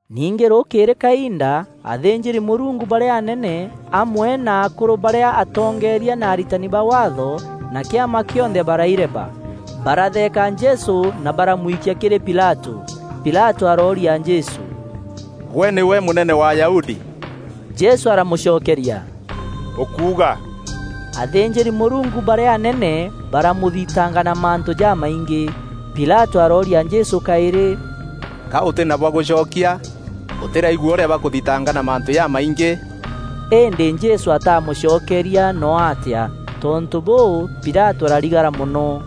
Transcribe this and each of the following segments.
Ningî rûkîîrî kainda, athînjîri-Mûrungu barîa anene, amwe na akûrû barîa atongeeria na aritani ba Waatho, na kîama kîonthe baraireba. Baratheeka Jesû na baramwikia kîrî Pilatû. Pilatû arooria Jesû, “Gwe nîgwe Mûnene wa Ayahudi?” Jesû aramûcokeria, “Ûkuuga.” Athînjîri-Mûrungu barîa anene baramûthitanga na mantû jamaingî. Pilatû arooria Jesû kaîrî, “Ka ûtî na bwa gûcokia? Ûtîraigua ûrîa bakûthitanga na mantû jamaingî?” Îndî Jesû ataamûcokeria no atîa, tontû bûû Pilatû ararigara mono.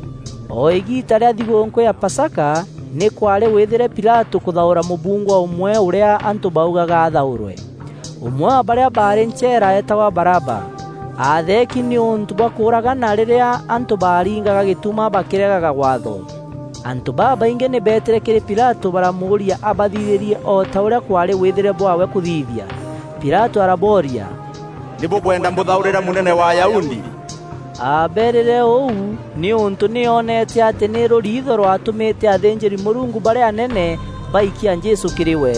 O îgiita rîa thigûûnkû ya Pasaka, nî kwaarî wîthîre Pilatû kûthaûra mûbungwa ûmwe ûrîa antû baugaga athaûrwe. Ûmwe wa barîa baarî ncheera eetagwa Baraba. Aatheeki nîûntû bwa kûûragana rîrîa antû baringaga gîtuma bakîregaga Waatho. Antû babaingî nî beetîre kîrî Pilatû baramûûria abathithîrie o ta ûrîa kwaarî wîthîre bwaawe kûthithia. Pilatû arabooria, “Nî bûkwenda mbûthaûrîra Mûnene wa Ayahudi?” Aabeerîre ûu nîûntû nî oonete atî nî rûriitho rwaatûmîte athînjîri-Mûrungu barîa anene baikia Jesû kîrî we.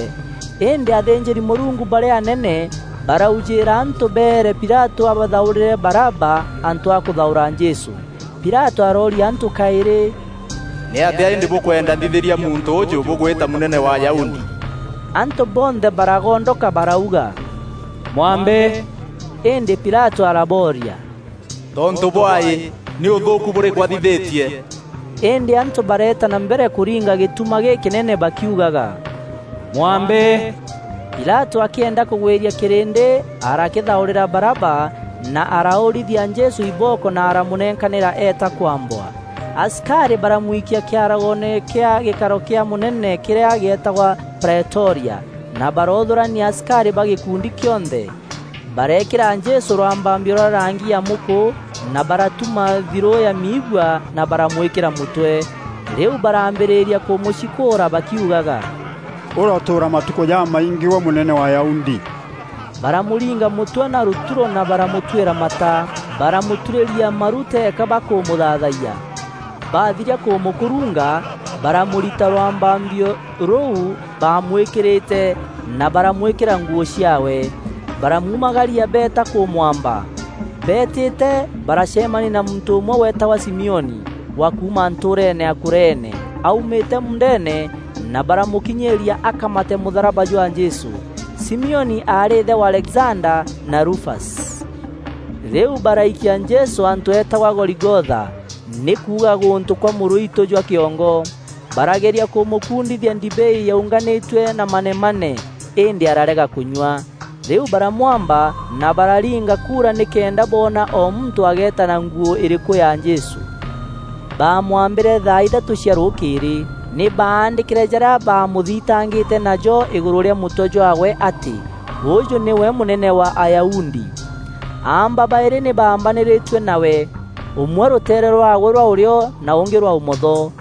Îndî athînjîri-Mûrungu barîa anene baraujîîra antû beere Pilatû abathaûrîre Baraba antû a kûthaûra Jesû. Pilatû arooria antû kaîrî, “Nîatîa îndî bûkwenda nthithîria muntû ûûjû bûgwîta Mûnene wa Ayahudi?” Antû bonthe baragondoka barauga, “Mwambe!” Îndî Pilatû arabooria, “Tontû bwaî? Nî ûthûûku bûrîkû athithîtie?” Îndî antû bareeta na mbere kûringa gîtuma gîkînene bakiugaga, “Mwambe!” Pilatû akîenda kûgwîria kîrîndî, arakîthaûrîra Baraba na araûrîthia Jesû ibooko na aramûnenkanîra eeta kwambwa. Asikarî baramwikia kîaragoone kîa gîkaro kîa mûnene kîrîa geetagwa Praetoria na baroothûrania asikarî ba gîkundi kîonthe. Bareekîra Jesû rwambambio rwa rangi ya mûkû na baratuma thirû ya miigua na baramwîkîra mûtwe. Rîu baraambîrîria kûmûcikûûra bakiugaga, “Ûrotûûra matukû jamaingî gwe Mûnene wa Ayahudi!” Baramûringa mûtwe na rûturo na baramûtwîra mata. Baramûturîria maru teeka bakûmûthaathayia. Bathiria kûmûkurunga, baramûrita rwambambio rûu baamwîkîrîte na baramwîkîra nguû ciaawe. Baramuumagaria beeta kûmwamba. Beetîte, baracemania na muntû ûmwe weetagwa Simioni, wa kuuma ntûûreene ya Kureene, aumîte muundeene na baramûkinyîîria akamate mûtharaba jwa Jesû. Simioni aarî îthe wa Alexanda na Rufasi. Rîu baraikia Jesû antû eetagwa Goligotha, (nî kuuga, “Gûntû kwa mûrûitû jwa kîongo”). Barageria kûmûkuundithia ndibei yaunganîtue na manemane, îndî ararega kûnyua. Rîu baramwamba na bararinga kuura nîkenda boona o muntû ageeta na nguû îrîkû ya Jesû. Baamwambîre thaa ithatû cia rûkîîrî. Nî baandîkîre jarîa baamûthitangîte najo îgûrû rîa mûtwe jwaawe atî: “Ûûjû nîwe Mûnene wa Ayahudi.” Aamba baîrî nî baambanîrîtue nawe. Ûmwe rûteere rwaawe rwa ûrîo na ûngî rwa ûmotho. [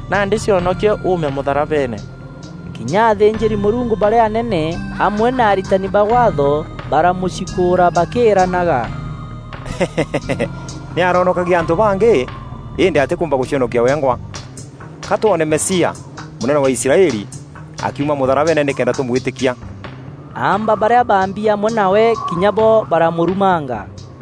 nandî cionokie uume mûtharabeene.” Kinya athînjîri-Mûrungu barîa anene amwe na aritani ba Waatho baramûcikûûra bakîîranaga: “Nî aroonokagia antû bangî îndî atîkûûmba gûcionokia wengwa. Ka twoone Mesia, Mûnene wa Israeli, akiuma mûtharabeene nîkenda tûmwîtîkia.” Aamba barîa baambi amwe nawe kinya bo baramûrumanga.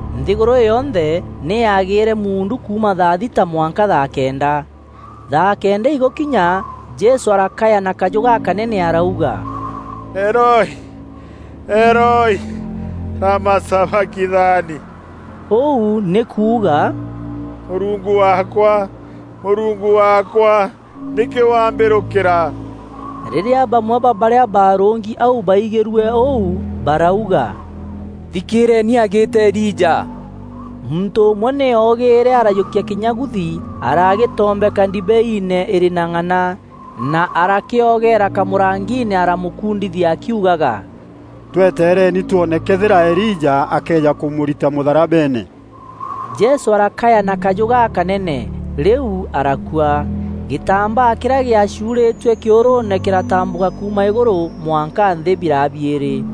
Nthîgûrû yonthe nî yaagîîre muundu kuuma thaa thita mwanka thaa kenda. Thaa kenda igûkinya, Jesû arakaya na kajû gakanene arauga, “Eloi, Eloi, lama sabakithani?” Ûu nî kuuga, “Mûrungu waakwa, Mûrungu waakwa, nîkî wambîrûkîra?” Rîrîa bamwe ba barîa baarûngi au baigîrue ûu, barauga, “Thikîîreeni agîîta Elija.” Muntû ûmwe nî ogîîre arajûkia kînyaguthi aragîtombeka ndibeiine îrî na ng'ana, na arakîogeera kamûrangiine aramûkundithia akiugaga, “Twetereni twoone këethîra Elija akeeja kûmûrita mûtharabeene.” Jesû arakaya na kajû gakanene, rîu arakua. Gîtambaa kîrîa gîacûûrîtue kîûrûûne kîratambûka kuuma îgûrû mwanka nthî, biraa biîrî.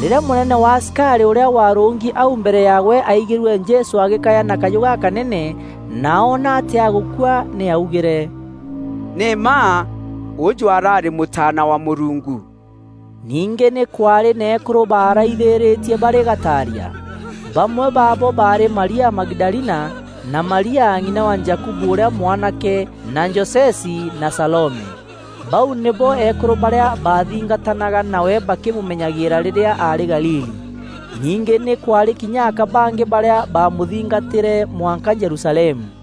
Rîrîa mûnene wa asikarî ûrîa waarûngi au mbere yaawe aigîrue Jesû agîkaya na kajû gakanene na oona atî agûkua nî augîre, “Nî mma ûûjû araarî Mûtaana wa Mûrungu!” Ningî nî kwaarî na eekûrû baaraithîîrîtie barî gataaria. Bamwe baabo baarî Maria Magidalina na Maria ng'ina wa Jakubu ûrîa mwanake na Josesi na Salome. Bau nîbo eekûrû barîa baathingatanaga nawe bakîmûmenyagîîra rîrîa aarî Galili. Ningî nî kwaarî kinya aka bangî barîa baamûthingatîre mwanka Jerusalemu.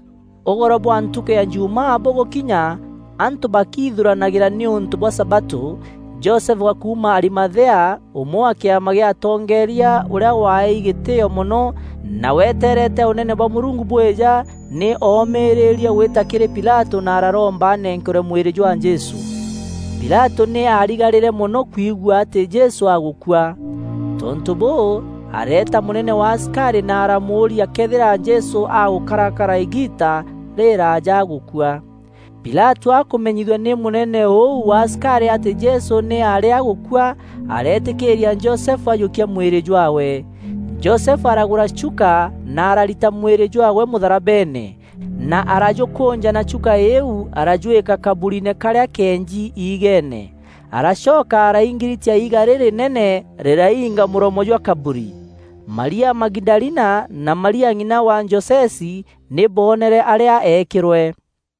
Ûgoro bwa ntukû ya Jumaa bûgûkinya, antû bakiithuranagîra nîûntû bwa sabatû, Josefu wa kuuma Arimathea, ûmwe wa kîama gîa atongeeria, ûrîa waaei gîtîîo mono, na weteerete Ûnene bwa Mûrungu bwîja, nî oomîrîrie gwîta kîrî Pilatû na araromba anenkerwe mwîrî jwa Jesû. Pilatû nî aarigarîre mono kwigua atî Jesû agûkua. Tontû bûû, areeta mûnene wa asikarî na aramûûria këethîra Jesû agûkarakara îgiita rîrîraaja agûkua. Pilatû akûmenyithua nî mûnene ûu wa asikarî atî Jesû nî aarî agûkua, areetîkîîria Josefu ajûkia mwîrî jwaawe. Josefu aragûra chuka, na ararita mwîrî jwaawe mûtharabeene, na arajûkûnja na chuka îîu arajwîka kaburiine karîa keenji iigeene. Aracoka araingiritia iiga rîrînene rîrainga mûromo jwa kaburi. Maria Magidalina na Maria ng'ina wa Josesi nî booneere arîa eekîrwe.